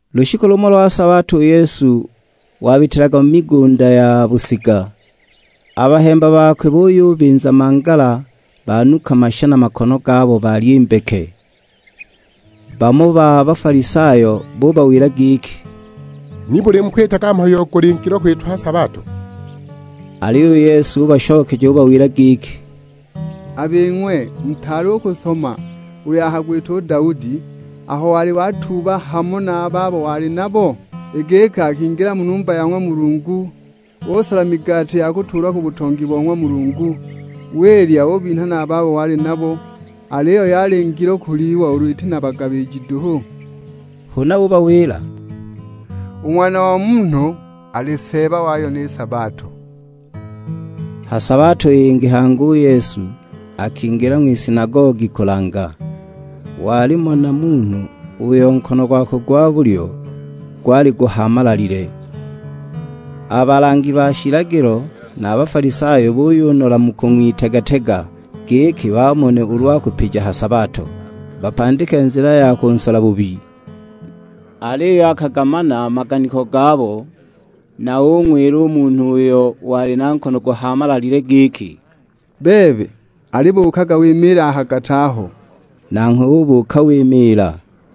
Lushiku lumo lwa sabato u Yesu wabitilaga mu migunda ya busiga, a bahemba bakwe buyubinza mangala banuka masha na makono gabo balya i mbeke. Bamo ba Bafalisayo bubawila giki, "Nibuli mukwitaga mhayo uyo guli ngilo kwitwa ha sabato?" Aliyo u Yesu ubashokeja ubawila giki. "A bing'we mutaali u kusoma uyo akagwita u Daudi aho wali watuuba, hamo na a babo wali nabo? I giki akingila mu numba ya ng'wa Mulungu, usola migati ya kutuulwa ku butongi bo ng'wa Mulungu, wilya ubinha na a babo wali nabo; aliyo yali ngilo kulyiwa ulu iti na bagabiji duhu?" Huna ubawila, "U Ng'wana o Munhu ali Seeba wayo ni sabato." Ha sabato yingi hangi u Yesu akingila ng'wisinagogi kulanga. Walimo na munhu uyo nkono gwakwe gwa bulyo gwali guhaamalalile. A balangi ba shilagilo na a Bafalisayo buyunola mu kung'witega-tega, giki bamone ulu akupija ha sabato, bapandike nzila ya kunsola bubi. Aliyo akagamana a maganiko gabo, na ung'wila u munhu uyo wali na nkono guhaamalalile giki, "Bebe, alibuukaga wimiile a ha gati aho." Nanghwe ubuuka wimiila.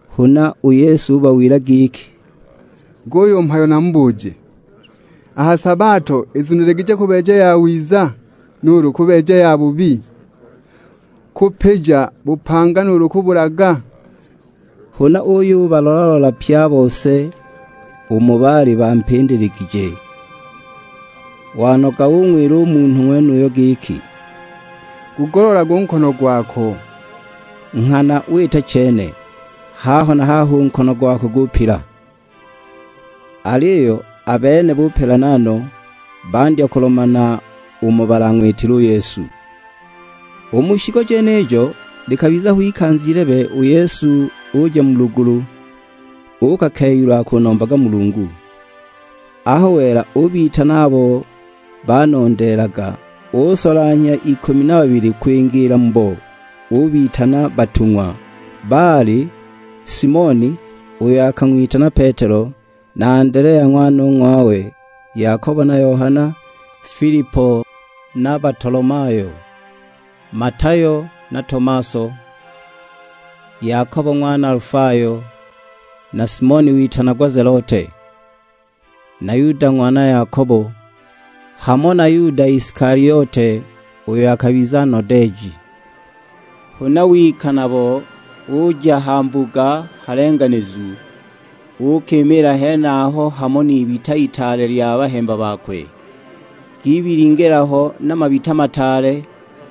Huna u Yesu ubawila giki, "Guyu mhayo namubuje, a ha sabato izuniligije kubeeja yawiza, nuulu kubeeja yabubi? Kupija bupanga, nuulu kubulaga?" Huna uyubalola-lola pye a bose umo baali bampindiligije; wanoga ung'wila u munhu ng'wenuyo giki, "Gugoloolage u nkono gwako." Nghana wita chene, haho na haho u nkono gakwe gupila. Aliyo a bene bupelana no, bandya kulomana umo balang'witile u Yesu. U mu shiku jenijo, likabiza ho ikanza ilebe, u Yesu uja mu lugulu uukakeyula akunombaga Mulungu. Aho wela ubitana abo banondeelaga, usolanhya ikumi na babili kwingiila mubo, ubitana batung'wa. Baali: Simoni, uyo akang'witana Petelo, na Andelea ng'wanong'wawe, Yakobo na Yohana, Filipo na Batolomayo; Matayo na Tomaso, Yakobo ng'wana Alifayo, na Simoni witanagwa Zelote. Na Yuda ng'wana Yakobo; hamo na Yuda Isikaliote, uyo akabiza nodeeji. Huna wika nabo uja ha mbuga halenganizu, uukimiila henaho hamo n'ibita itaale lya bahemba bakwe. Gibilingila ho na mabita mataale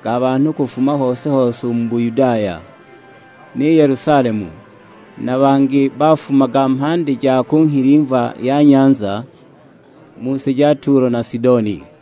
ga banhu kufuma hose-hose u mu Buyudaya, ni Yelusalemu; na bangi bafumaga mhandi ja ku nghilimva ya nyanza, mu si ja Tulo na Sidoni.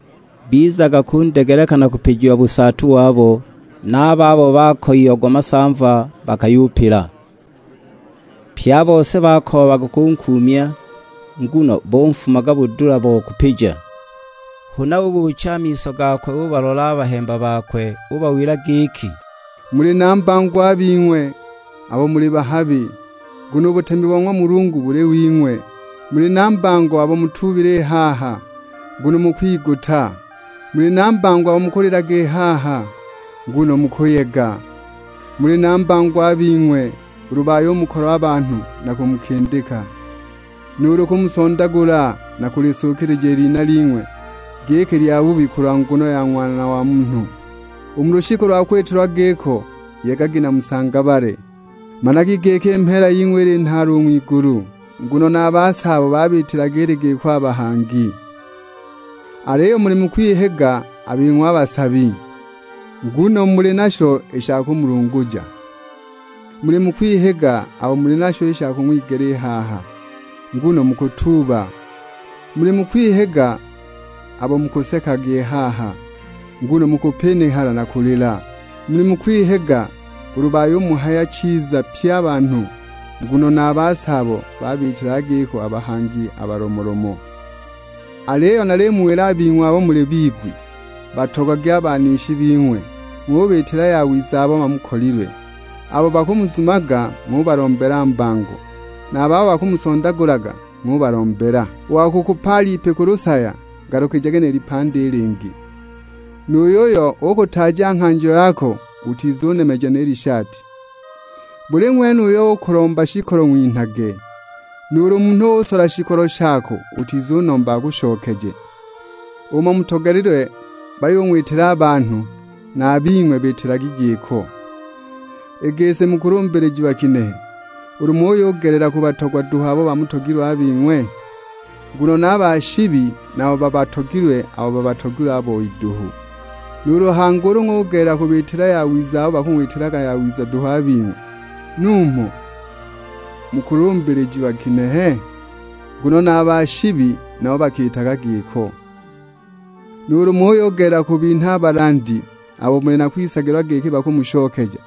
Bizaga kundegeleka na kupijiwa busaatu wabo; na a babo bakoyiagwa masamva, bakayupila. Pye a bose bakoobaga kunkuumya, nguno bonfumaga budula bo kupija. Huna ubuucha a miso gakwe ubalola a bahemba bakwe, ubawila giki, "Muli na mbango a bing'we, abo muli bahabi, nguno u butemi bo ng'wa Mulungu buli wing'we. Muli na mbango abo mutuubile i haha, nguno mukwiguta. Muli na mbango abo mukulilaga i haha, nguno mukuyega. Muli na mbango a bing'we ulu bayumukolwa a banhu na kumukindika, nuulu kumusondagula na kulisukilija i lina ling'we giki lyabubi kulwa nguno ya Ng'wana wa Munhu. U mu lushiku lwa kwitilwa giko, yegagi na musangabale; managi giki i mheela ying'we ili nhaale u ng'wigulu, nguno na a basaabo babiitilaga ili giko a bahangi." "Aliyo muli mu kwihiga, a bing'we a basabi, nguno muli nasho i sha kumulunguja. Muli mu kwihiga abo muli nasho i sha kung'wigela i haha, nguno mukutuuba. Muli mu kwihiga abo mukusekaga i haha, nguno mukupinihala na kulila! Muli mu kwihiga, ulu bayumuhaya chiza pye a banhu, nguno na a basaabo babiitilaga giko a bahangi a balomolomo." "Aliyo nalimuwila a bing'we abo muli bigwi, batogagwi a banishi bing'we; ng'ubiitila yawiza abo bamukolilwe. Abo bakumuzumaga ng'ubalombela mbango, na a babo bakumusondagulaga ng'ubalombela. U wa kukupaala ipi ku lusaya ngalukijage ni lipandi i lingi; nu yuyo ukutaaja nghanjo yako utizunemeja ni lishati. Buli ng'wene uyo ukulomba shikolo ng'winhage, nuulu munhu usola shikolo shako utizunomba akushokeje. Umo mutogelilwe bayung'witila a banhu, na a bing'we biitilagi giko. I gisi mukulumbilijiwa ginehe ulu muyugelela kubatogwa duhu abo bamutogilwe a bing'we? Nguno na a ba shibi nabo babatogilwe abo babatogilwe a boi duhu! Nuulu hangi ulu ng'ugelela kubiitila yawiza abo bakang'witilaga yawiza duhu a bing'we, numho mukulumbilijiwa ginehe? Nguno na a ba shibi nabo bakiitaga giko! Nuulu muyugelela kubinha a balandi abo muli na kwisagilwa giki bakumushokeja,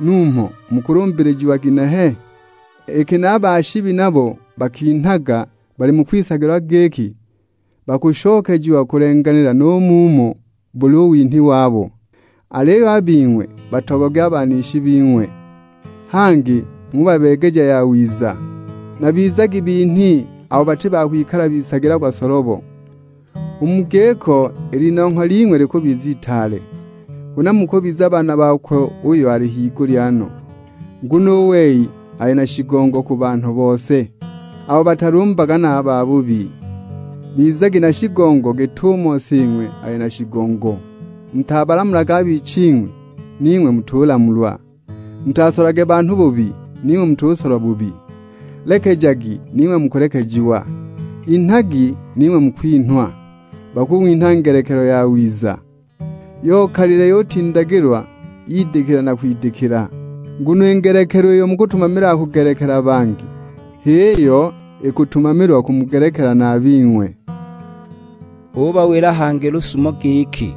numho mukulumbilijiwa ginehe? Iki na a ba shibi nabo bakinhaga bali mu kwisagilwa giki bakushokejiwa kulenganila nu mumo buli u winhi wabo! Aliyo a bing'we batogagwi a banishi bing'we, hangi ng'ubabeegeja yawiza. Na bizagi binhi abo bati ba kwikala bisagilagwa solobo, u mu giko i linongho ling'we likubiza itaale. Huna mukubiza baana bakwe uyo ali higulya no, nguno u wei ali na shigongo ku banhu bose; abo batalumbaga na a babubi." Bizagi na shigongo, git'umo Sing'we ali na shigongo. "Mutabalamulage a biching'wi, ning'we mutulamulwa, mutasolage banhu bubi, ning'we mutusolwa bubi; lekejagi ning'we mukulekejiwa. Inhagi, ning'we mukwinhwa; bakung'winha ngelekelo yawiza, yokalile yutindagilwa yidikila na kwandikila. Nguno i ngelekelo iyo mukutumamilaga kugelekela bangi, h'iyo ikutumamilwa kumugelekela na a bing'we." Ubawila hangi lusumo giki,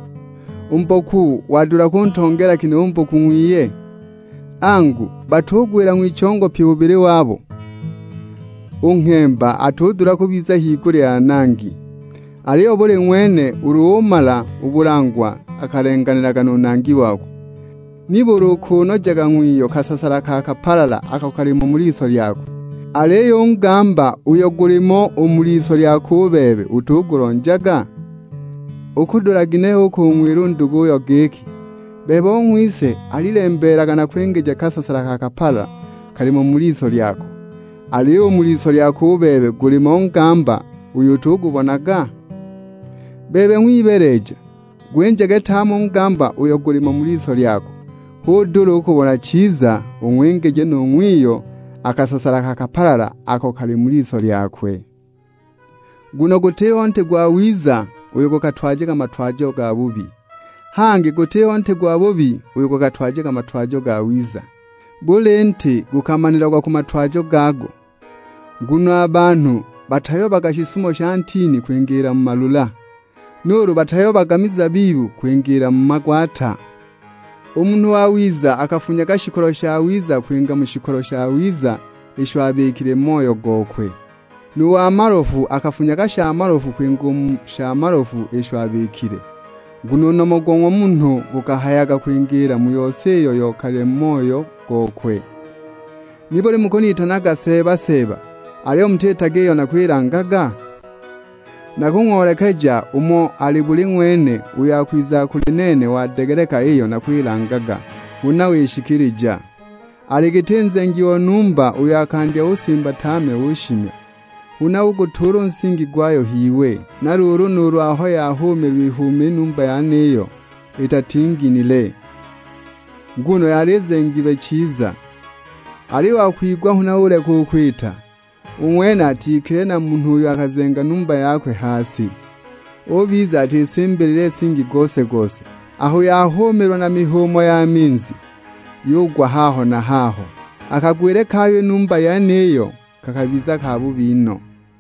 "U mboku wadula kuntongeela ginehe u mboku ng'wiye? Angu, batugwila ng'wichongo pyi bubili wabo? U nghemba atudula kubiza higulya ya nangi, aliyo buli ng'wene ulu umala u bulangwa akalenganilaga nu nangi wakwe. Nibuli ukunojaga ng'wiyo kasasala ka kapalala ako kali mu liso lyakwe, aliyo u ngamba uyo gulimo u mu liso lyako u bebe utugulonjaga? Ukudula ginehe u kung'wila u nduguyo giki, 'Bebe ong'wise, alilembeelaga nakwingije kasasala ka kapalala, kalimo u mu liso lyako,' aliyo u mu liso lyako u bebe gulimo ngamba uyo utugubonaga? Bebe ng'wibeeleja, gwinjage tame u ngamba uyo gulimo u mu liso lyako, hu udule u kubona chiza, ung'wingije nu ng'wiyo a kasasala ka kapalala ako kali mu liso lyakwe!" "Nguno gutiho nti gwawiza uyo gukatwajaga matwajo gabubi; hangi gutiho nti gwabubi uyo gukatwajaga matwajo gawiza. Buli nti gukamanilagwa ku matwajo gago; nguno a banhu batayobaga shisuumo sha ntini kwingiila mu malula; nuulu batayobaga mizabibu kwingiila mu magwata! U munhu wawiza, akafunyaga shikolo shawiza kwinga u mu shikolo shawiza isho abikile mu moyo gokwe. Nu wa malofu akafunyaga sha malofu kwinga u mu sha malofu isho abikile; nguno u nomo go ng'wa munhu gukahayaga kwingiila mu yose iyo yokalile mu moyo gokwe." "Nibuli mukunitanaga Seeba, Seeba, aliyo mutitaga iyo nakwilangaga? Nakung'oolekeja umo ali buli ng'wene uyo akwizaga kuli nene wadegeleka iyo nakwilangaga, huna wishikilija. Ali giti nzengi o numba uyo akandya usimba tame ushimya, huna ugutuula u nsingi gwayo h'iwe. Na luulu nuulu aho yahumiilwa ihuuma i numba yeniyo, itatinginile. Nguno yali izengilwe chiza. Aliyo u wa kwigwa huna uleka u kwita, u ng'wene atikilile na munhu uyo akazenga numba yakwe ha si, ubiza atisimbilile nsingi gose-gose. Aho yahumiilwa na mihuumo ya minzi, yugwa haho na haho; a kagwile kayo i numba yeniyo kakabiza kabubi no!"